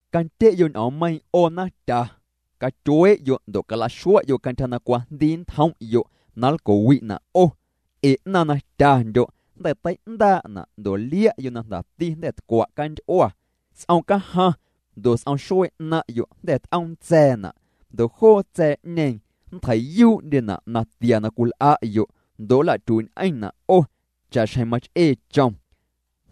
¡Candye'yo' ñ'oommeiiⁿ 'o naⁿtya! ¡Catyuee'yo' ndo' cala'xua'yo' cantyja na cwajndii nntjom'yo' na nlco'wi'na' 'o! Ee 'naⁿ na tyandyo', jnda̱ tei'ndaa'na', ndo' lia'yo' na jndati jnda̱ tcwa' canty'ua. S'om cajaⁿ ndo' s'om xuee 'naⁿ'yo' jnda̱ t'oom ntsa̱a̱na', ndo' joo tsa̱a̱'ñeeⁿ nntjei'yuu'ndyena' na tia na cwil'a'yo', ndo' nla'tyuii'ñ'eⁿna' 'o cha'xjeⁿ mach'ee chom.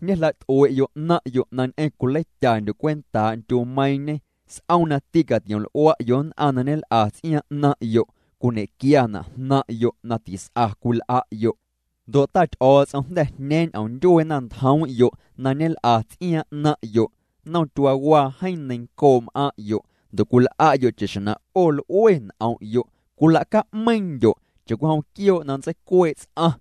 Ñejla't'ue'yo' 'naⁿ'yo' na ñ'eⁿ cwileityandyo' cwentaa' ndyumeiiⁿñe. S'om na tîcatiom'l'ua'yo' nn'aⁿ na ñel'a ts'iaaⁿ 'naⁿ'yo' cwiñequiana' jnaⁿ'yo' na tis'a cwil'a'yo'. Ndo' Ta Ty'o̱o̱ts'om jnda̱ jñeeⁿ ñ'omndyuee naⁿntjoom'yo' na ñel'a ts'iaaⁿ 'naⁿ'yo'. Nnom tyuaawaa jeeⁿ neiⁿncoo' m'aⁿ'yo' ndo' cwil'a'yo' cha'xjeⁿ na 'o l'ue n'om'yo', cwila'ca'meiiⁿndyo' cha'cwijom quioo' na nntseicuee' ts'aⁿ.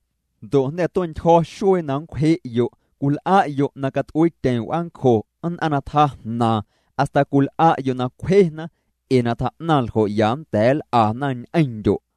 Ndo' jnda̱ tue'ntyjo̱ xuee na nncwje'yo'. Cwil'a'yo' na cat'uiityeⁿ w'aancjo nn'aⁿ na tjaa jnaaⁿ hasta cwil'a'yo' na cwjena, ee na tjaa'naⁿ ljo' ya nnda̱a̱ nl'ana ñ'eⁿndyo'.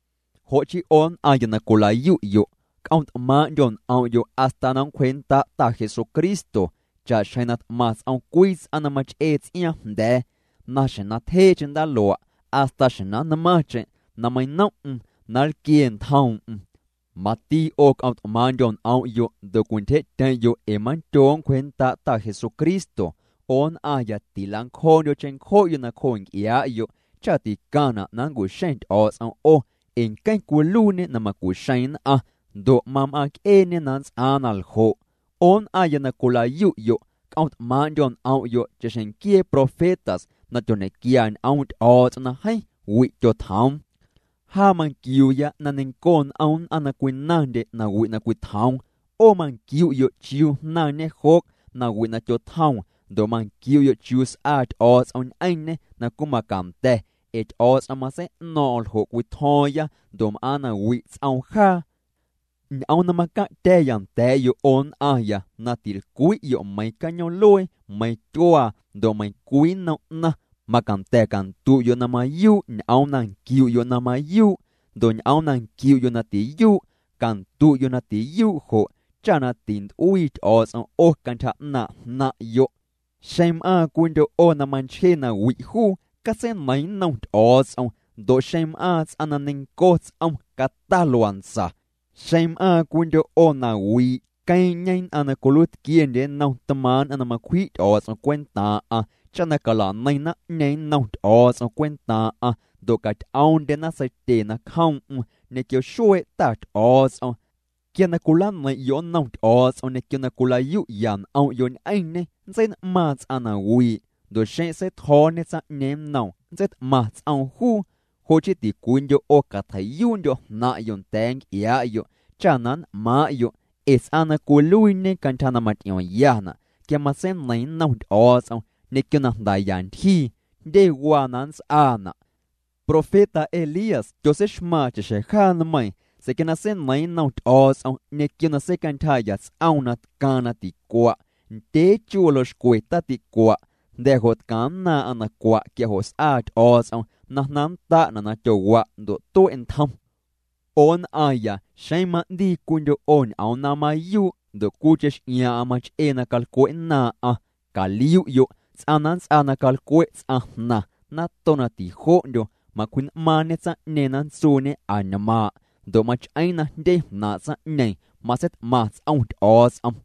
Jo' chii 'o nn'aⁿya na cwila'yu'yo' c'om't'maaⁿ'ndyo' n'om'yo' hasta na nncwjee'nnda' Ta Jesucristo. Cha'xjeⁿ na t'maⁿ ts'om cwii ts'aⁿ na mach'ee ts'iaaⁿ jnda̱a̱, na xjeⁿ na tyjee'cheⁿ ndaalua' hasta xjeⁿ na nnmaⁿcheⁿ na meiⁿnom'm na nlquie ntjoom'm. Mati 'o c'om't'maaⁿ'ndyo' n'om'yo' ndo' cwintyje'tyeⁿ'yo', ee mandyoo' nncwjee'nnda' Ta Jesucristo. 'O nn'aⁿya, tila'ncjoo'ndyo' cheⁿncjo'yo' nacjoo nc'iaa'yo' cha ticaⁿna' na nncu'xeⁿ Ty'o̱o̱ts'om 'o ee nqueⁿ cwiluiiñê na macu'xeeⁿ nn'aⁿ, ndo' mam'aaⁿc'eeñê na nnts'aaⁿ naljo'. 'O nn'aⁿya na cwila'yu'yo', c'om't'maaⁿ'ndyo' n'om'yo' cha'xjeⁿ nquiee profetas na tyoñequia ñ'oom' Ty'o̱o̱ts'om na jeeⁿ wi' tyotjoom. Jaa manquiuuya na neiⁿnco n'om nn'aⁿ na cwinaⁿndye nawi' na cwitjoom. 'O manquiu'yo' chiuu jnaⁿñe Job nawi' na tyotjoom ndo' manquiu'yo' chiuu s'aa Ty'o̱o̱ts'om ñ'eⁿñê na cwimacanda̱, ee Ty'o̱o̱ts'om matsei'no̱o̱ⁿ'o̱ⁿ ljo' cwitjo̱o̱ⁿya ndo' m'aaⁿ na wi' ts'oom jaa. Ñ'oom na macaⁿ'tya̱ya nda̱a̱'yo' 'o nn'aⁿya, na tilcwi'yo' meiⁿ cañoom'luee, meiⁿ tyuaa ndo' meiⁿcwii nnom 'naⁿ, macanda̱ candu'yo' na mayuu' ñ'oom na nquiu'yo' na mayuu' ndo' ñ'oom na nquiu'yo' na tiyuu', candu'yo' na tiyuu' jo' cha na tint'uii Ty'o̱o̱ts'om 'o cantyja 'naaⁿ' jnaⁿ'yo'. Xeⁿ m'aaⁿ cwiindyo' 'o na manchje nawi' juu, catseineiⁿ nnom Ty'o̱o̱ts'om. Ndo' xeⁿ m'aaⁿ ts'aⁿ na neiⁿnco ts'om cata luantsa. Xeⁿ m'aaⁿ cwiindyo' 'o na wii', queeⁿ'ñe nn'aⁿ na cwiluiitquiendye nnom tmaaⁿ' nn'aⁿ na macwji' Ty'o̱o̱ts'om cwentaaⁿ'aⁿ cha na cala'neiⁿ naⁿ'ñeeⁿ nnom Ty'o̱o̱ts'om cwentaaⁿ'aⁿ, ndo' caty'oomndyena seitye nacjoom'm ñequio xuee' Ta Ty'o̱o̱ts'om. Quia na cwilaneiⁿ'yo' nnom Ty'o̱o̱ts'om ñequio na cwilayu'ya n'om'yo' ñ'eⁿñê, nntsein'maaⁿ ts'aⁿ na wii', ndo' xeⁿ na seitjo̱o̱ñe tsaⁿ'ñeeⁿ nnoom nntseit'maⁿ ts'oom juu. Jo' chii ticwiindyo' 'o catjei'yuu'ndyo' jnaⁿ'yo' nda̱a̱ nc'iaa'yo', cha na nn'maaⁿ'yo'. Ee ts'aⁿ na cwiluiiñe cantyja na maty'iomyana', quia matseineiⁿ nnom Ty'o̱o̱ts'om ñequio na jndaya ntyjii, jndye waa na nnts'aana'. Profeta Elías tyotseixmaaⁿ cha'xjeⁿ jaa nmeiiⁿ, sa̱a̱ quia na seineiiⁿ nnom Ty'o̱o̱ts'om ñequio na seicantyjaa'ya ts'oom na tcaaⁿ na ticua', ndyee chu waljoo' xcwe taticua'. Jnda̱ jo' tcaⁿnnaaⁿ'aⁿ na cua', quia jo' s'aa Ty'o̱o̱ts'om na jnaⁿnnda'na' na tyowa' ndo' tue' ntjom. 'O nn'aⁿya, xeⁿ ma'ndii cwiindyo' 'o ñ'oom na mayuu', ndo' cwii x'iaaⁿ'aⁿ mach'ee na calcwe'nnaaⁿ'aⁿ, caliu'yo', ts'aⁿ na nnts'aa na calcwe' ts'aⁿjnaⁿ nato na tijo'ndyo', macwji'n'maaⁿñê tsaⁿ'ñeeⁿ na nntsuuñe añmaaⁿ', ndo' mach'eeⁿ na jndye jnaaⁿ' tsaⁿ'ñeeⁿ matseit'maⁿ ts'om Ty'o̱o̱ts'om.